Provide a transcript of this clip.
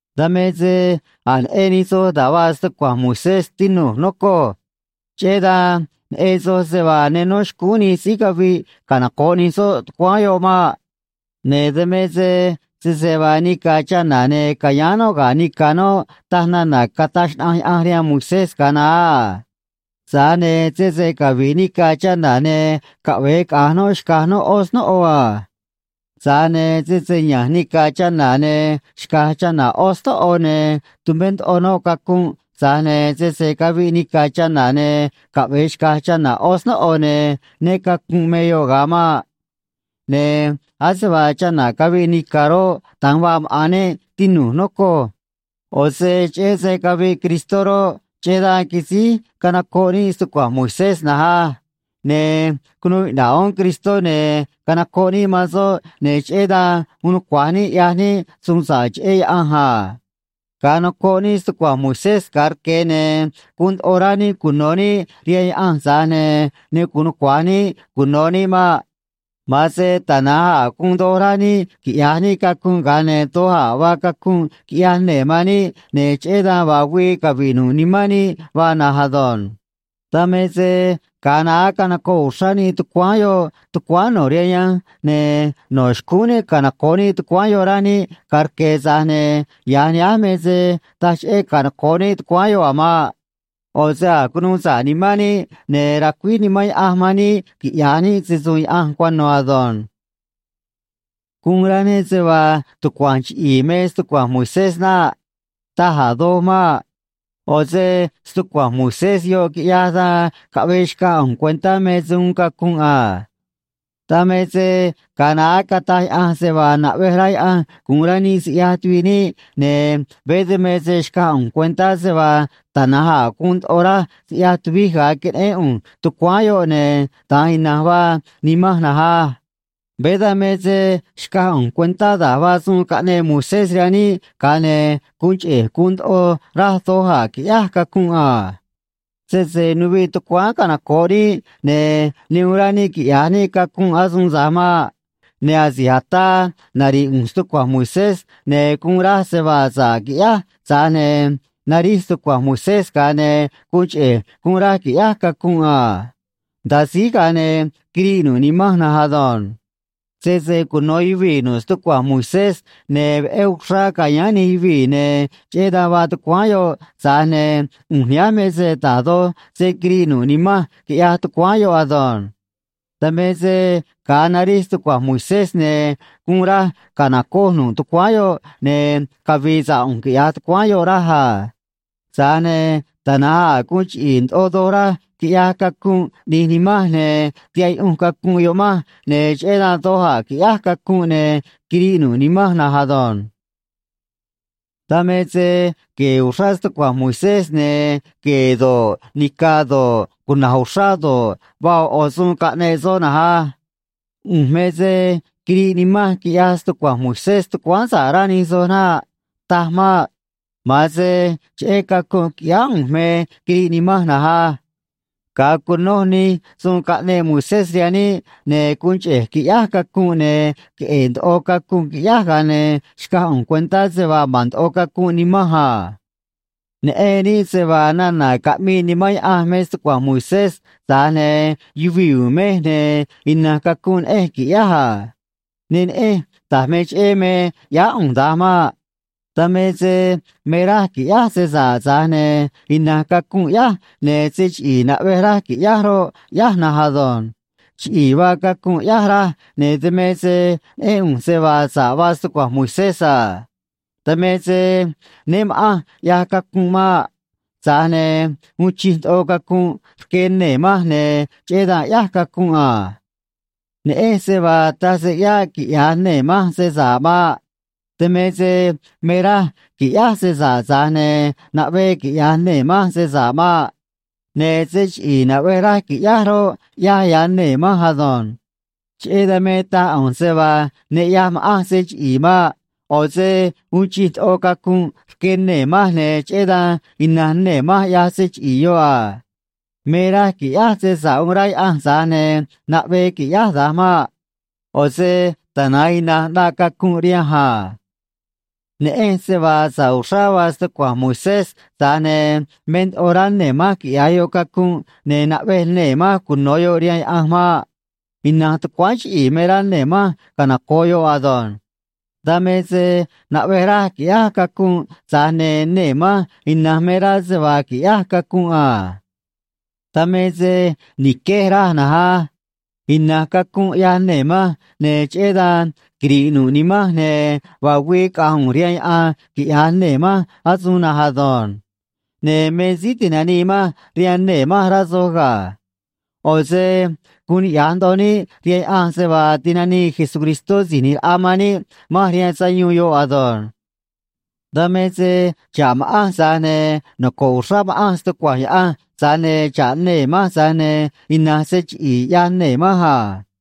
Dan me se a̱j neꞌen nij soj da̱j vaa stucua̱nj Moisés, tinu̱j, nocoj. Cheꞌé dan neꞌen soj se vaa ne nó xcúún nij síí caviꞌ canoco̱ꞌ nij soꞌ tucuáán yoꞌ maꞌ. Ne̱ dan me se sese vaa nica̱ chana̱, ne̱ ca̱yáán noꞌ ga̱ nica̱ noꞌ, taj nana̱ cataj xnaꞌanj Yaꞌanj rihaan Moisés ga̱a naá a. Tza̱j ne̱ sese cavi̱ꞌ nica̱ chana̱, ne̱ caꞌve̱e caꞌa̱nj noꞌ xca̱j noꞌ ꞌó snóꞌo a. Tza̱j ne̱ sese ya̱nj nica̱ chana̱ ne̱ xca̱j chana̱ ꞌó snóꞌo, ne̱ tumé ndoꞌo noꞌ cacunꞌ, tza̱j ne̱ sese caviꞌ nica̱ chana̱, ne̱ caꞌve̱e xca̱j chana̱ ꞌó snóꞌo, ne̱ né cacu̱nꞌ me yoꞌ ga̱a maꞌ. Ne̱ ase vaa chana̱ caviꞌ nica̱ roꞌ, da̱nj vaa maꞌa̱n níꞌ, tinu̱j, nocoj. ꞌO̱ se cheꞌé se caviꞌ Cristó roꞌ, cheꞌé dan quisíj canocoꞌ níꞌ stucua̱nj Moisés na̱nj á. Ne̱ cunuu iꞌna̱ꞌ uún Cristó, ne̱ canocoꞌ níꞌ man soꞌ, ne̱ cheꞌé dan uun nucua̱j níꞌ ꞌyaj níꞌ suun sa̱ꞌ cheꞌé Yaꞌanj a. Ga̱a nocoꞌ níꞌ stucua̱nj Moisés ga̱a rque̱, ne̱ guun ndoꞌo rá níꞌ cuno̱ níꞌ rihaan Yaꞌanj, tza̱j ne̱ ne gu̱un nucua̱j níꞌ cuno̱ níꞌ maꞌ. Ma̱an se tana̱nj a̱ guun doj rá níꞌ quiꞌya̱j níꞌ cacunꞌ, ga̱a ne̱ doj a̱ vaa cacunꞌ quiꞌyaj nee̱ man níꞌ, ne̱ cheꞌé dan vaa güii cavi̱ꞌ nu̱ꞌ nimán níꞌ vaa na̱nj ado̱nj. Dan me se ga̱a naá canocoꞌ uxrá níꞌ tucuáán yoꞌ tucuáán no̱ rihaan yanj, ne̱ no̱ xcúún níꞌ canoco̱ꞌ níꞌ tucuáán yoꞌ, rá níꞌ ga̱a rque̱, tza̱j ne̱ ya̱j nihánj me se taj cheꞌé canoco̱ꞌ níꞌ tucuáán yoꞌ a̱ maꞌ. ꞌO̱ se a̱j cunuu sa̱ꞌ nimán níꞌ, ne̱ racuíj Nimán Yaꞌanj man níꞌ quiꞌya̱j níꞌ se‑su̱u̱n Yaꞌanj cuano̱ ado̱nj. Guun rá níꞌ se vaa tucua̱nj chiꞌi̱i̱ me stucua̱nj Moisés naꞌ. Taj a̱ doj maꞌ. ꞌO̱ se stucua̱nj Moisés yoꞌ quiꞌyaj dan caꞌvee xcaj ꞌu̱nj cuentá me se uun cacunꞌ a. Dan me se ga̱a naá cataj Yaꞌanj se vaa naꞌvej rá Yaꞌanj gu̱un rá níꞌ siꞌyaj tuviꞌ níꞌ, ne̱ veé dan me se xcaj ꞌu̱nj cuentá se vaa tana̱nj a̱ guun ndoꞌo raj siꞌyaj tuvij ga̱a queneꞌén ꞌu̱nj tucuáán yoꞌ, ne̱ da̱nj ina̱nj vaa nimanj na̱nj á. Veé dan me se xcaj ꞌu̱nj cuentá da̱j vaa suun caꞌneꞌ Moisés rihaan níꞌ, ga̱a ne̱ guun cheꞌe̱j guun ndoꞌo raj doj a̱ qui̱ꞌyáj cacunꞌ a. Sese nuviꞌ tucuáán canoco̱ꞌ níꞌ, ne̱ ne uun rá níꞌ quiꞌya̱j níꞌ cacunꞌ asuun tza̱j maꞌ. Ne̱ asi̱j ataa nari̱ꞌ ꞌu̱nj stucua̱nj Moisés, ne̱ guun raj se vaa sa̱ꞌ quiꞌyáj, tza̱j ne̱ narij stucua̱nj Moisés, ga̱a ne̱ guun cheꞌe̱j guun raj qui̱ꞌyáj cacunꞌ a. Nda̱a síj, ga̱a ne̱ quiriꞌ nu̱ꞌ nimanj na̱nj ado̱nj. Sese cuno̱ yuvii̱ nu̱ꞌ stucua̱nj Moisés, ne̱ veꞌé uxrá ca̱yáán nij yuvii̱, ne̱ cheꞌé dan vaa tucuáán yoꞌ, tza̱j ne̱ ꞌu̱nj nihánj me se da̱j doj se quiriꞌ nu̱ꞌ nimanj, quiꞌyaj tucuáán yoꞌ ado̱nj. Dan me se ga̱a narij stucua̱nj Moisés, ne̱ guun raj ca̱nocoj nu̱ꞌ tucuáán yoꞌ, ne̱ cavi̱i̱ sa̱ꞌ ꞌu̱nj, quiꞌya̱j tucuáán yoꞌ, raj a. Tza̱j ne̱ tana̱nj a̱ guun chiꞌi̱i̱ ndoꞌo doj raj, quiꞌyaj cacunꞌ ꞌni̱j nimanj, ne̱ tihaꞌ yuꞌunj cacunꞌ yoꞌ manj, ne̱ cheꞌé dan doj a̱ quiꞌyáj cacunꞌ, ne̱ quiriꞌ nu̱ꞌ nimanj na̱nj ado̱nj. Dan me se gue̱e̱ uxrá stucua̱nj Moisés, ne̱ gue̱e̱ do̱ꞌ, nica̱ do̱ꞌ, cuna̱j uxrá do̱ꞌ, vaa ꞌo̱ ꞌo̱ suun caꞌneꞌ soꞌ na̱nj á. ꞌU̱nj me se quiriꞌ nimanj quiꞌyaj stucua̱nj Moisés tucuáán sa̱ꞌ, rá nij soj naꞌ. Taj maꞌ. Ma̱an se cheꞌé cacunꞌ quiꞌyáá ꞌu̱nj me quiriꞌ nimanj na̱nj á. Ga̱a cunoj nij suun caꞌneꞌ Moisés rihaan níꞌ, ne̱ guun cheꞌe̱j quiꞌyáj cacunꞌ, ne̱ queꞌe̱e̱ ndoꞌo cacunꞌ quiꞌyáj, ga̱a ne̱ xcaj ꞌu̱nj cuentá se vaa ma̱n ndoꞌo cacunꞌ nimanj a. Neꞌen níꞌ se vaa nana̱ caꞌmii Nimán Yaꞌanj me stucua̱nj Moisés, tza̱j ne̱ yuvii̱ u̱u̱n mej, ne̱ ina̱nj cacunꞌ neꞌenj qui̱ꞌyáj a. Ne neꞌenj da̱j me cheꞌé me ꞌyáá ꞌu̱nj da̱nj maꞌ. Dan me se me raj qui̱ꞌyáj se sa̱ꞌ, tza̱j ne̱ ina̱nj cacunꞌ ꞌyáj, ne̱ se chiꞌi̱i̱ naꞌvej raj qui̱ꞌyáj roꞌ, ꞌyáj na̱nj ado̱nj. Chiꞌi̱i̱ vaa cacunꞌ ꞌyáj, raj, ne̱ dan me se neꞌén ꞌu̱nj se vaa sa̱ꞌ vaa stucua̱nj Moisés a. Dan me se né ma̱ꞌanj ꞌyaj cacunꞌ maꞌ. Tza̱j ne̱ uun chij ndoꞌo cacunꞌ rque nee̱ manj, ne̱ cheꞌé dan ꞌyáj cacunꞌ a. Neꞌenj se vaa taj se ꞌyáꞌ quiꞌya̱j nee̱ manj se sa̱ꞌ maꞌ. Dan me se me raj qui̱ꞌyáj se sa̱ꞌ, tza̱j ne̱ naꞌvee quiꞌya̱j nee̱ manj se sa̱ꞌ maꞌ. Ne̱ se chiꞌi̱i̱ naꞌvej raj qui̱ꞌyáj roꞌ, ꞌyáj, ꞌyaj nee̱ manj ado̱nj. Cheꞌé dan me taj ꞌu̱nj se vaa ne ꞌyaj ma̱ꞌanj se chiꞌi̱i̱ maꞌ. ꞌO̱ se uun chij ndoꞌo cacunꞌ rque nee̱ manj, ne̱ cheꞌé dan ina̱nj nee̱ manj ꞌyaj se chiꞌi̱i̱ yoꞌ a. Me raj qui̱ꞌyáj se sa̱ꞌ uun rá Yaꞌanj, tza̱j ne̱ naꞌvee qui̱ꞌyáj da̱nj maꞌ. ꞌO̱ se tana̱nj ina̱nj ꞌnaꞌ cacunꞌ rihanj a. Neꞌenj se vaa sa̱ꞌ uxrá vaa stucua̱nj Moisés, tza̱j ne̱ me ndoꞌo rá nee̱ manj quiꞌya̱j yoꞌ cacunꞌ, ne̱ naꞌvej nee̱ manj cuno̱ yoꞌ rihaan Yaꞌanj maꞌ. Ina̱nj tucuáán chiꞌi̱i̱ me rá nee̱ manj canoco̱ꞌ yoꞌ ado̱nj. Dan me se naꞌvej raj qui̱ꞌyáj cacunꞌ, tza̱j ne̱ nee̱ manj ina̱nj me rá se vaa qui̱ꞌyáj cacunꞌ a. Dan me se ni̱quej, raj na̱nj á. Ina̱nj cacunꞌ ꞌyaj nee̱ manj, ne̱ cheꞌé dan quiri̱ꞌ nu̱ꞌ nimanj, ne̱ vaa güii caꞌa̱nj ꞌu̱nj rihaan yaꞌan, quiꞌya̱j nee̱ manj asuun na̱nj ado̱nj. Ne̱ me síí ti̱nanii manj rihaan nee̱ manj, rá soj ga̱. ꞌO̱ se guun niꞌya̱j ndoꞌo níꞌ rihaan Yaꞌanj se vaa tinanii Jesucristó Si̱j ꞌNi̱j Raꞌa man níꞌ manj rihaan sayuun yoꞌ ado̱nj. Dan me se xa̱ꞌ ma̱ꞌanj, tza̱j ne̱ noco̱ꞌ uxrá ma̱ꞌanj stucua̱nj Yaꞌanj, tza̱j ne̱ xa̱ꞌ nee̱ manj, tza̱j ne̱ ina̱nj se chiꞌi̱i̱ ꞌyaj nee̱ manj a.